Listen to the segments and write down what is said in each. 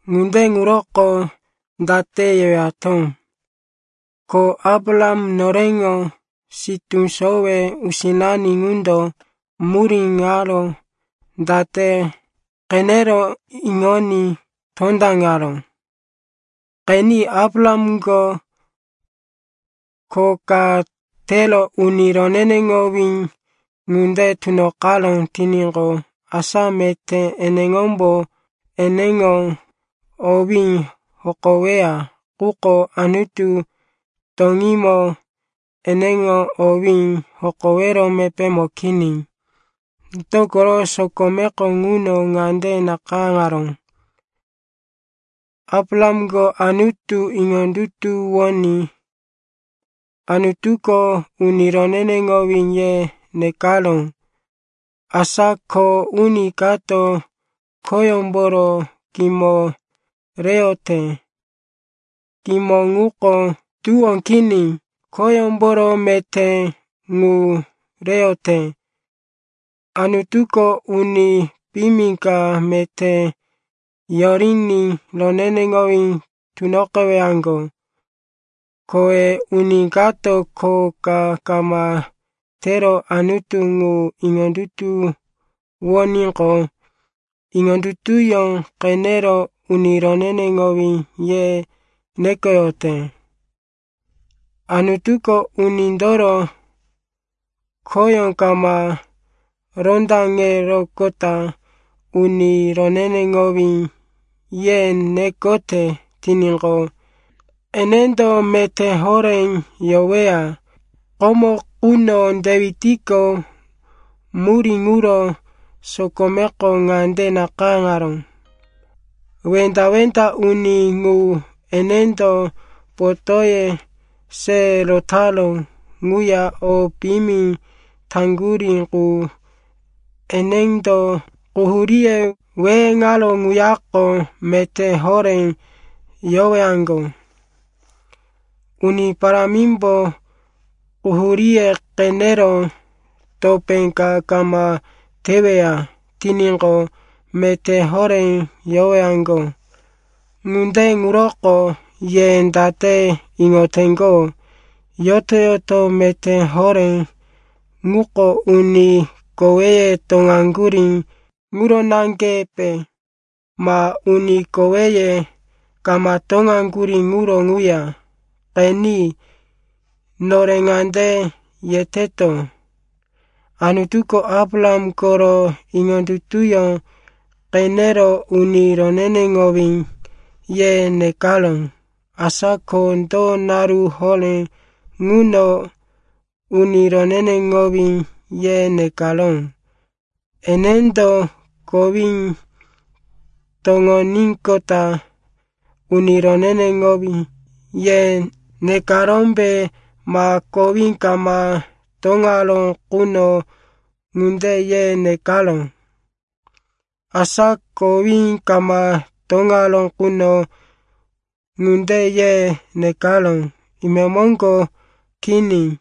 Ŋunde ŋuroko date yewato? Ko Abraham, noreŋo sitú sowe usinani ŋundo murí ŋaro date qenero iŋoní tondaŋaró? Qeni, Abrahamko kho ka tero uni roneneŋowí ŋunde tunoqaró tiníqo, asa meté eneŋombo eneŋo owí hokoweya. Quko Anutu toŋímo eneŋo owí hokowero mepémo kini. Dokoro sokomeko ŋuno ŋande nakayáŋaró, “Abrahamko Anutu iŋondutuwoní Anutuko, uni roneneŋowí, ye nekaró.” Asa kho uni kato khoyómboro kimo reyote. Kimo ŋuko tuwó kini, khoyómboro meté ŋu reyote. Anutuko uni piyimi ka meté yoriní roneneŋowí tunoqewaŋgo. Kowe uni kato kho ka kama tero Anutu ŋu iŋondutuwoníqo, iŋondutuyó qenero, uni roneneŋowí, ye nekoyote. Anutuko unindoro khoyó kama rondaŋeroqota, uni roneneŋowí, ye nekote tiníqo, enendo meté horé yoweya. Komo quno Dewitko murí ŋuro sokomeko ŋande nakayáŋaró, “Wenda-wenda uni ŋu, enendo potóye se rotaró ŋuya o piyimi taŋgurí qu, enendo quhuríye weheŋaró ŋuyako meté horé yowaŋgo. Uni Parámimbo quhuríye qenero topé ka kama teweya tiníqo, meté horé yowaŋgo.” Ŋunde ŋuroko ye date iŋoteŋgo, yoto-yoto meté horé ŋuko uni koweye toŋaŋgurí ŋuro naŋgepe, ma uni koweye kama toŋaŋgurí ŋuro ŋuya? Qeni, nore ŋande yeteto, Anutuko Abraham koro iŋondutuyó qenero, uni roneneŋowí, ye nekaró. Asa ko do naru horé ŋuno, uni roneneŋowí, ye nekaró? Enendo kowí toŋoníqota, uni roneneŋowí, ye nekarómbe, ma kowí kama toŋaró quno, ŋunde ye nekaró? Asa kowí kama toŋaró quno, ŋunde ye nekaró, imemoŋgo kini.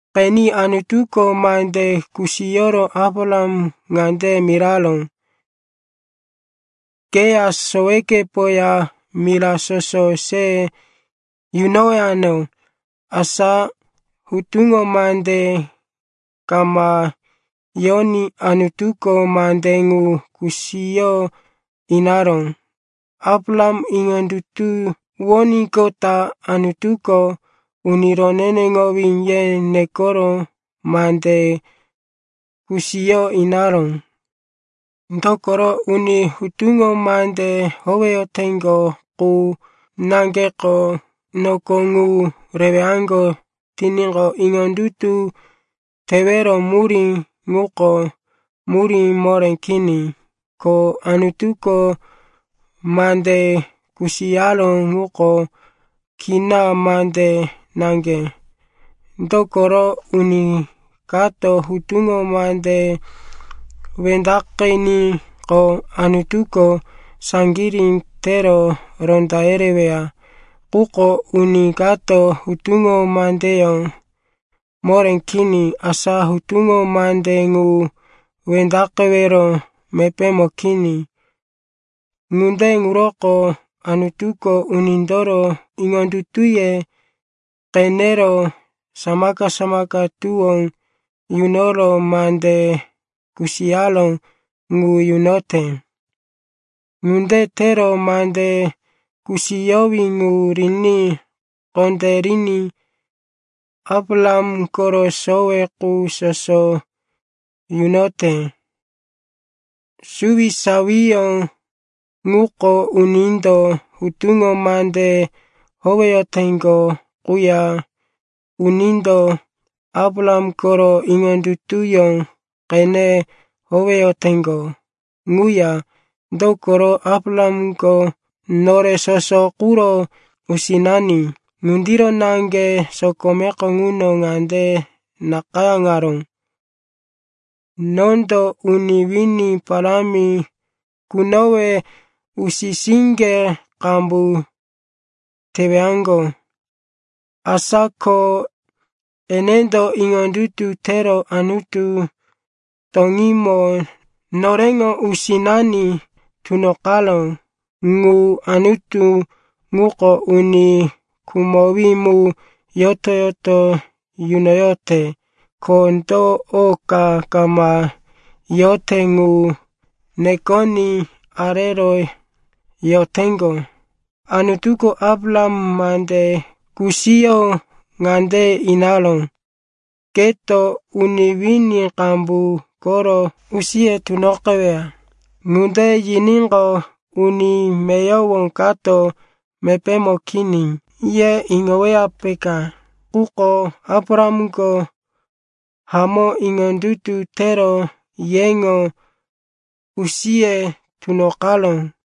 Qeni, Anutuko mande kusiyoro Abraham ŋande miraró, “Keya sowekepoya mira soso se yunowano.” Asa hutuŋo mande kama yoní Anutuko mande ŋu kusiyo inaró. Abraham iŋondutuwoníqota Anutuko, uni roneneŋowí, ye nekoro mande kusiyo inaró. Dokoro uni hutuŋo mande howeyoteŋgo qu naŋgeko noko ŋu rewaŋgo tiníqo, iŋondutu tewero murí ŋuko murí moré kini, ko Anutuko mande kusiyaró ŋuko kina mande naŋge. Dokoro uni kato hutuŋo mande wendaqiníqo, Anutuko saŋgirí tero ronda yereweya. Quko uni kato hutuŋo mandeyó moré kini, asa hutuŋo mande ŋu wendaqewero mepémo kini. Ŋunde ŋuroko Anutuko unindoro iŋondutuye qenero samaka-samaka tuwó yunoro mande kusiyaró ŋu yunote. Ŋunde tero mande kusiyowí ŋu riní kondériní Abraham koro sowe qu soso yunote. Suwisawiyó ŋuko unindo hutuŋo mande howeyoteŋgo quya unindo Abraham koro iŋondutuyó qene howeyoteŋgo ŋuya. Dokoro Abrahamko nore soso quro usinani. Ŋundiro naŋge sokomeko ŋuno ŋande nakayáŋaró, “Nondo uni wini parámi kunowe usi-siŋge qambu tewaŋgo.” Asa ko enendo iŋondutu tero Anutu toŋímo noreŋo usinani tunoqaró. Ŋu Anutu ŋuko uni khumowí mu yoto-yoto yunoyote. Ko do o ka kama yote ŋu nekoní arero yoteŋgo. Anutuko Abraham mande kusiyo ŋande inaró, “Keto uni wini qambu koro usiye tunoqeweya.” Ŋunde yiníqo, uni meyowo kato, “Mepémo kini,” ye iŋoweya, peka. Quko Abrahamko hamó iŋondutu tero yeŋo usiye tunoqaró.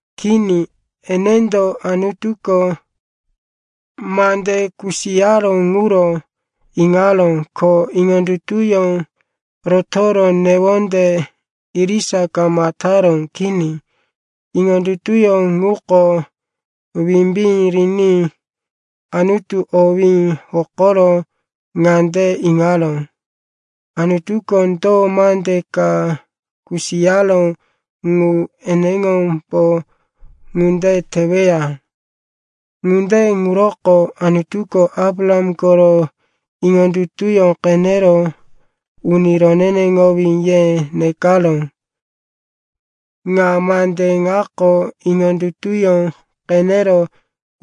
Kini, enendo Anutuko mande kusiyaró ŋuro iŋaró, ko iŋondutuyó rotoro newonde irisa kama taró. Kini, iŋondutuyó ŋuko wimbí riní Anutu owí hokoro ŋande iŋaró, Anutuko do mande ka kusiyaró ŋu eneŋombo ŋunde teweya. Ŋunde ŋuroko Anutuko Abraham koro iŋondutuyó qenero, uni roneneŋowí, ye nekaró. Ŋa mande ŋako, “iŋondutuyó qenero,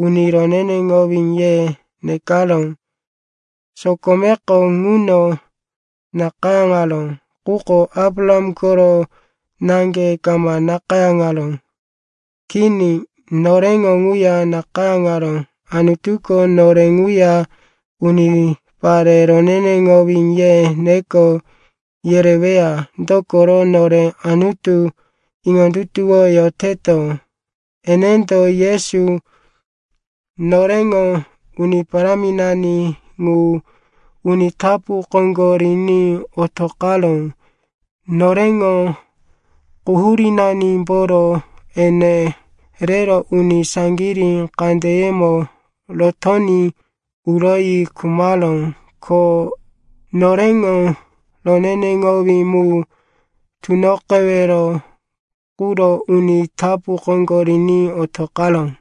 uni roneneŋowí, ye nekaró,” sokomeko ŋuno nakayáŋaró, quko Abraham koro naŋge kama nakayáŋaró. Kini. Noreŋo ŋuya nakayáŋaró. Anutuko nore ŋuya, unipare roneneŋowí, ye neko yereweya. Dokoro nore Anutu iŋondutuwoyoteto. Enendo Yesu, noreŋo Uni Paráminani ŋu, uni tapu koŋgo riní otoqaró. Noreŋo quhurínanimboro ene rero uni saŋgirí kandeyemo rotoní uroyi khumaró, ko noreŋo roneneŋowí mu tunoqewero quro uni tapu koŋgo riní otoqaró.